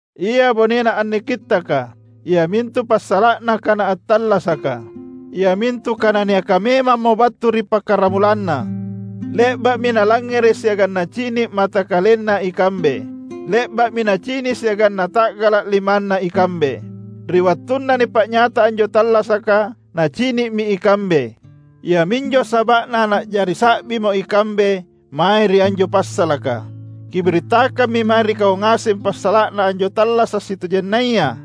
Ia bonena anne kittaka, iamintu passala’na Kana attallasaka, iamintu Kana niaka memammo battu ri pakkaramulanna. Le’ba’mi nalangngere’ siagang nacini’ mata kalenna ikambe. Le’ba’mi nacini’ siagang nata’gala’ limanna ikambe. Ri wattunna nipa’nyata anjo tallasaka, nacini’mi ikambe. Iaminjo saba’na na’jari sa’bimo ikambe mae ri anjo passalaka. Kibirittakammi mae ri kau ngaseng passala’na anjo tallasa’ sitojennaya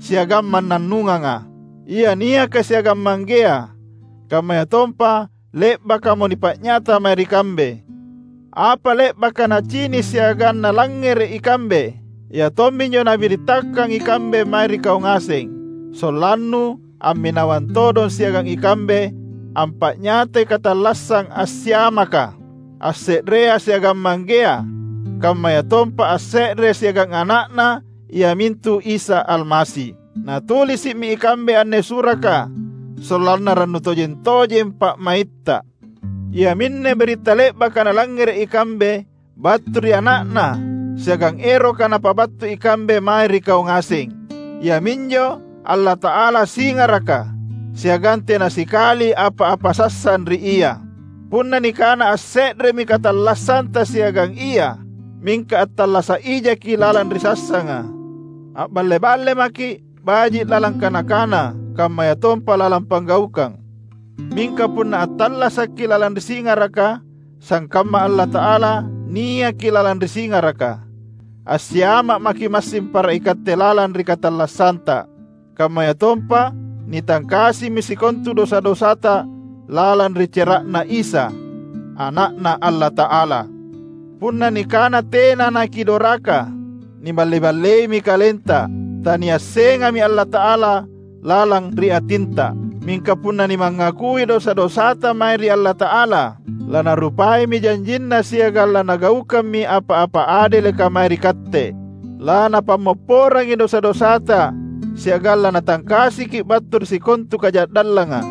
siagang mannannunganga, ia niaka siagang Manggea, kammayatompa le’bakamo nipa’nyata mae ri kambe. Apa le’baka nacini’ siagang nalangngere’ ikambe, ia tomminjo nabirittakang ikambe mae ri kau ngaseng; sollannu amminawang todong siagang ikambe ampa’nyatai katallassang assiamaka, asse’rea siagang Manggea, kammayatompa asse’re siagang Ana’Na iamintu Isa Almasi. Natulisi’mi ikambe anne suraka sollanna rannu tojeng-tojeng pa’maitta. Iaminne biritta le’baka nalangngere’ ikambe battu ri Ana’Na siagang eroka napabattu ikambe mae ri kau ngaseng: Iaminjo Allata’ala singaraka, siagang tena sikali apa-apa sassang ri Ia. Punna nikana asse’remi katallassanta siagang Ia, mingka attallasa’ ijaki’ lalang ri sassanga, a’balle-balle maki’, baji’ lalang kana-kana kammayatompa lalang panggaukang. Mingka punna attallasakki’ lalang ri singaraka, sangkamma Allata’ala niaki lalang ri singaraka, assiama’ maki’ massing para ikatte lalang ri katallassanta; kammayatompa nitangkasimi sikontu dosa-dosata lalang ri cera’Na Isa, Ana’Na Allata’ala. Punna nikana tena nakidoraka, niballe-balleimi kalenta; taniassengami Allata’ala lalang ri atinta. Mingka punna nimangakui dosa-dosata mae ri Allata’ala, laNarupaimi janjinNa siagang laNagaukammi apa-apa adeleka mae ri katte. LaNapammopporangi dosa-dosata siagang laNatangkasiki’ battu ri sikontu kaja’dallanga.